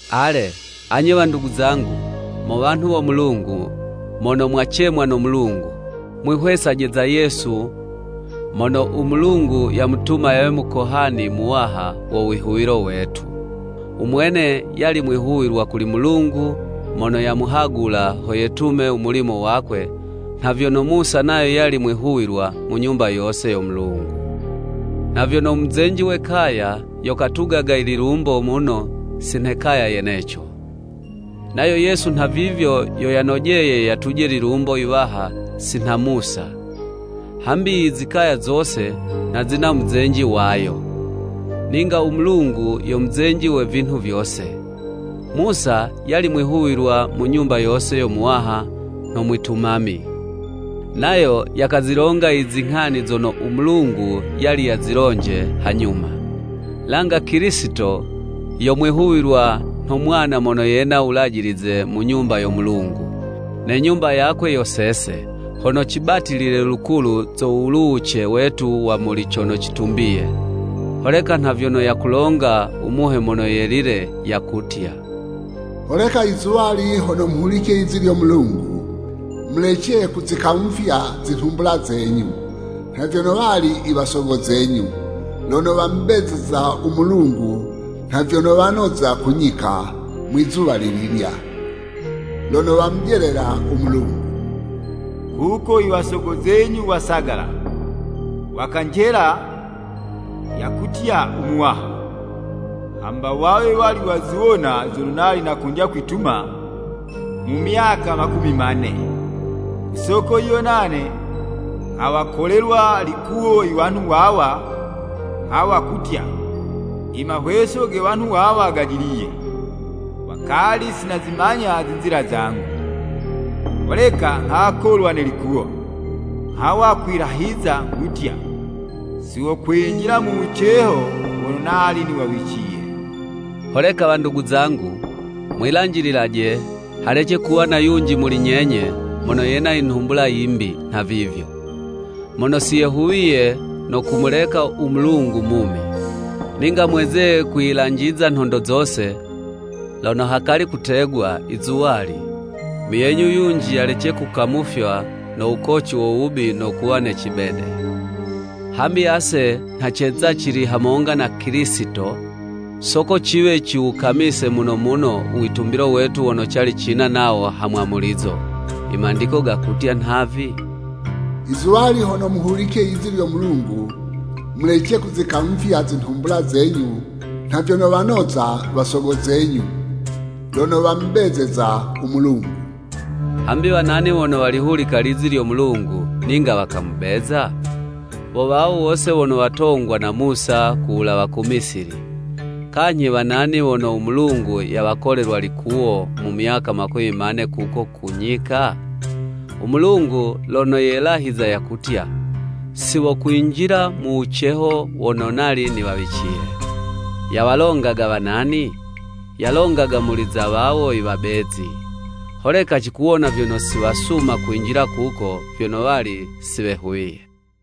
Ale, anye wandugu zangu, mo wanhu wo Mulungu, mono mwacemwa no Mulungu, mwihwesaje za Yesu mono u Mulungu yamutuma yawe Mukohani Muwaha wo wihuwilo wetu. U mwene yali mwihuwilwa kuli Mulungu mono yamuhagula ho yetume u mulimo wakwe, nha vyono Musa nayo yali mwihuwilwa mu nyumba yose yo Mulungu. Nha vyono u muzenji we kaya yo katugaga i lilumbo muno si nhe kaya yeneco. Nayo Yesu nhavivyo yo yanojeye yatuje lilumbo yiwaha si nha Musa. Hambi i zikaya zose, nha zina u muzenji wayo, ninga u Mulungu yo muzenji we vinhu vyose. Musa yali mwihuwilwa mu nyumba yose yo Muwaha nho mwitumami, nayo yakazilonga i zinghani zono u Mulungu yali yazilonje hanyuma. Langa Kilisito yo mwihuwilwa nho mwana mono yena wulajilize mu nyumba yo Mulungu. Ne nyumba yakwe yo sese, hono cibatilile lukulu zo wuluwuce wetu wa muli cono citumbiye. Holeka nha vyono yakulonga u Muhe Mono Yelile, yakutya: “Holeka i zuwali hono muhulice lizi lyo Mulungu, Mulece kuzikamufya zinhumbula zenyu, nha vyono wali i wasogo zenyu, lono wamubezeza u Mulungu, nha vyono wanoza ku nyika mwizuwa lililya, lono wamujelela u Mulungu. Kuko i wasogo zenyu wasagala, wakanjela yakutya u Muwaha, hamba wawe wali waziwona zono nali nakondya kwituma mu myaka makumi mane.” Ku soko yiyo nane nghawakolelwa likuwo i wanhu wawa, nghawa kutya, “I mahweso ge wanhu wawa gajiliye, wakali si nazimanya zinzila zangu.” Holeka nghakolwa ne likuwo, nghawa kwilahiza nghutya, “Si wokwinjila mu wuceho wono nali niwawiciye.” Holeka wandugu zangu, mwilanjililaje, halece kuwa na yunji muli nyenye, mono yena i nhumbula yimbi nhavivyo, mono si yehuwiye no kumuleka u Mulungu mumi. Ninga mweze kwiyilanjiza nhondo zose, lono hakali kutegwa, “I zuwali,” muyenyu yunji yalece kukamufywa no wukoci wo wubi no kuwa ne cibede. Hambi ase nha ceza cili hamonga na Kilisito, soko ciwe ciwukamise muno muno u witumbilo wetu wono cali cina nawo hamwamulizo. I Mandiko gakutya nhavi: “I zuwali hono muhulice lizi lyo Mulungu mulece kuzikamufya zinhumbula zenyu nha vyono wanoza wasogo zenyu lono wamubezeza u Mulungu.” Hambi wa nani wono walihulika lizi lyo Mulungu ninga wakamubeza? Wo wawo wose wono watongwa na Musa ku wulawa ku Misili. Kanyhi wa nani wono u Mulungu yawakolelwa likuwo mu myaka makumi mane kuko ku nyika? U Mulungu lono yelahiza yakutya, “Si wokwinjila mu wuceho wono nali niwawiciye.” Yawalongaga wa nani? Yalongaga muli za wawo i wabezi. Holeka cikuwona vyono si wasuma kwinjila kuko, vyono wali si wehuwiye.